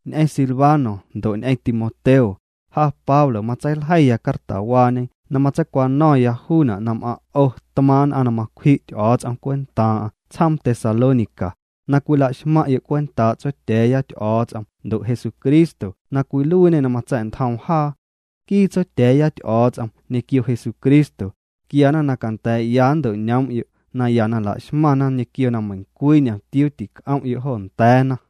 Ñ'eⁿ Silvano ndo' ñ'eⁿ Timoteo, ja Pablo matseiljeiya cartawaañe na matseicwano̱ⁿya juuna' na m'aⁿ' 'o tmaaⁿ' nn'aⁿ na macwji' Ty'o̱o̱ts'om cwentaaⁿ'aⁿ tsjoom Tesalónica, na cwila'xmaⁿ'yo' cwentaa' Tsotya̱a̱ya Ty'o̱o̱ts'om ndo' Jesucristo na cwiluiiñê na matsa̱'ntjoom jaa. Nquii Tsotya̱a̱ya Ty'o̱o̱ts'om ñequio Jesucristo, quiana na canda̱a̱'ya nto'ñoom'yo' naya na la'xmaⁿna ñequio na meiⁿcwii ñomtiuu tinc'om'yo' jo nda̱a̱na.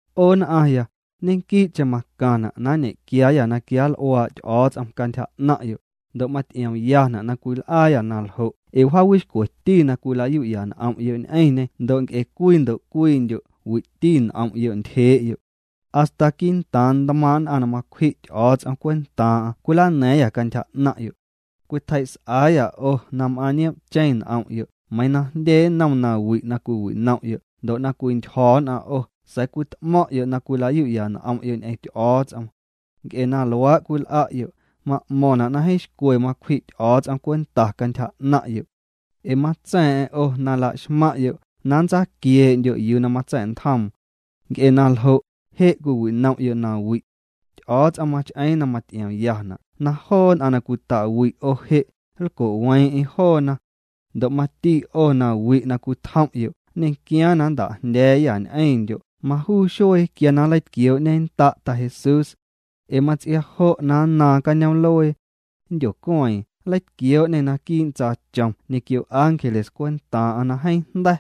'O nn'aⁿya, ñequii'cheⁿ macaⁿna' na nñequiaayâ na quianl'uaa' Ty'o̱o̱ts'om cantyja 'naⁿ'yo', ndo' maty'iomyana' na cwil'aayâ na ljo' ee wjaawixcweti na cwila'yu'ya n'om'yo' ñ'eⁿñê ndo' nc'e cwii ndo' cwiindyo' wi'ti n'om'yo' ntyjee'yo'. Hasta quii'ntaaⁿ ntmaaⁿ' nn'aⁿ na macwji' Ty'o̱o̱ts'om cwentaaⁿ'aⁿ cwilana̱a̱ⁿyâ cantyja 'naⁿ'yo'. Cwitjei's'aayâ 'o na m'aⁿ' nioom'cheⁿ n'om'yo' meiiⁿ na jndye nnom nawi' na cwiwinom'yo' ndo' na cwintyjo̱ nn'aⁿ 'o sa̱a̱ cwit'mo̱ⁿ'yo' na cwila'yu'ya n'om'yo' ñ'eⁿ Ty'o̱o̱ts'om. Nc'e na luaa' cwil'a'yo', ma'mo̱ⁿna' na jeeⁿ xcwe macwji' Ty'o̱o̱ts'om cwenta cantyja 'naⁿ'yo'. Ee matsa̱a̱ⁿ'a̱ⁿ 'o na la'xmaⁿ'yo' na nntsaquiee'ndyo' yuu na matsa̱'ntjoom. Nc'e na ljo', je' cwiwinom'yo' nawi'. Ty'o̱o̱ts'om mach'eeⁿ na maty'iomyana' na joo nn'aⁿ na cwita'wi' 'o je', nlco'weeⁿ'eⁿ joona. Ndo' mati 'o na wi' na cwitjom'yo' nñequiaaⁿ na nnta'jndya̱a̱yâ ñ'eⁿndyo' majuu xuee quia na nleitquioo'ñennda' Ta Jesús. Ee mats'ia jo' na nnaaⁿ cañoom'luee nndyocueeⁿ. Nleitquioo'ñê naquii' ntsaachom ñequio ángeles cwentaaⁿ'aⁿ na jeeⁿ jnda̱.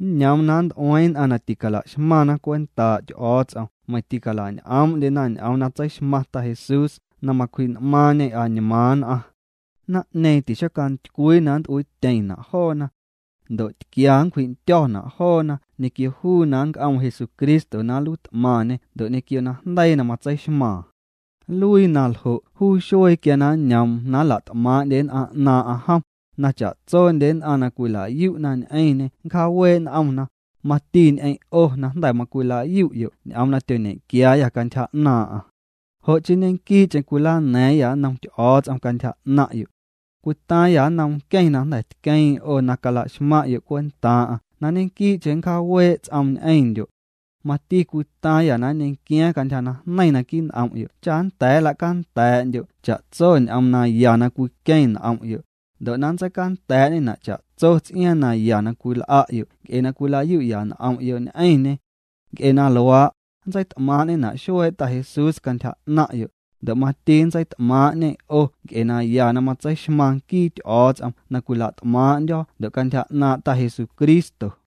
Nñoom na nnt'ueeⁿ nn'aⁿ na ticala'xmaⁿna cwentaa' Ty'o̱o̱ts'om meiⁿ tical'añ'oomndyena ñ'oom na tseixmaⁿ Ta Jesús na macwji'n'maaⁿñê añmaaⁿ nn'aⁿ. Naⁿ'ñeeⁿ tixocantycwii na nnt'uiityeⁿna' joona. Ndo' tquia nncwji'ndyo̱na' joona ñequio yuu na nnc'oom Jesucristo na nluiit'maⁿñê ndo' ñequio najndeii na matseixmaaⁿ. Nluii na ljo' juu xuee quia na nñoom na nla't'maa'ndye nn'aⁿ 'naaⁿ'aⁿ jom, na cha'tsondye nn'aⁿ na cwila'yu'na ñ'eⁿñê nncjaawee' n'omna, mati ñ'eⁿ' 'o na jnda̱ macwila'yu'yo' ñ'oom na tyoñequiaayâ cantyja 'naaⁿ'aⁿ. Jo' chii ñequii'cheⁿ cwilana̱a̱ⁿyâ nnom Ty'o̱o̱ts'om cantyja 'naⁿ'yo'. Cwitaaⁿyâ nnom nqueⁿ na jnda̱ tqueeⁿ 'o na cala'xmaⁿ'yo' cwentaaⁿ'aⁿ na ñequii'cheⁿ nncjaawee' ts'oom ñ'eⁿndyo'. Mati cwitaaⁿyâ na nñequiaaⁿ cantyja najneiⁿ naquii' n'om'yo' cha nnda̱a̱ nla'canda̱'ndyo' cha'tso ñ'oom na ya na cwiqueⁿ n'om'yo', ndo' na nntseicanda̱a̱'ñena' cha'tso ts'iaaⁿ na ya na cwil'a'yo' nc'e na cwila'yu'ya n'om'yo' ñ'eⁿñê. Nc'e na luaa', nntseit'maaⁿ'ñena' xuee' Ta Jesús cantyja 'naⁿ'yo', ndo' mati nntseit'maaⁿ'ñê 'o nc'e naya na matseixmaⁿ nquii Ty'o̱o̱ts'om na cwila't'maaⁿ'ndyo̱ ndo' cantyja 'naaⁿ' Ta Jesucristo.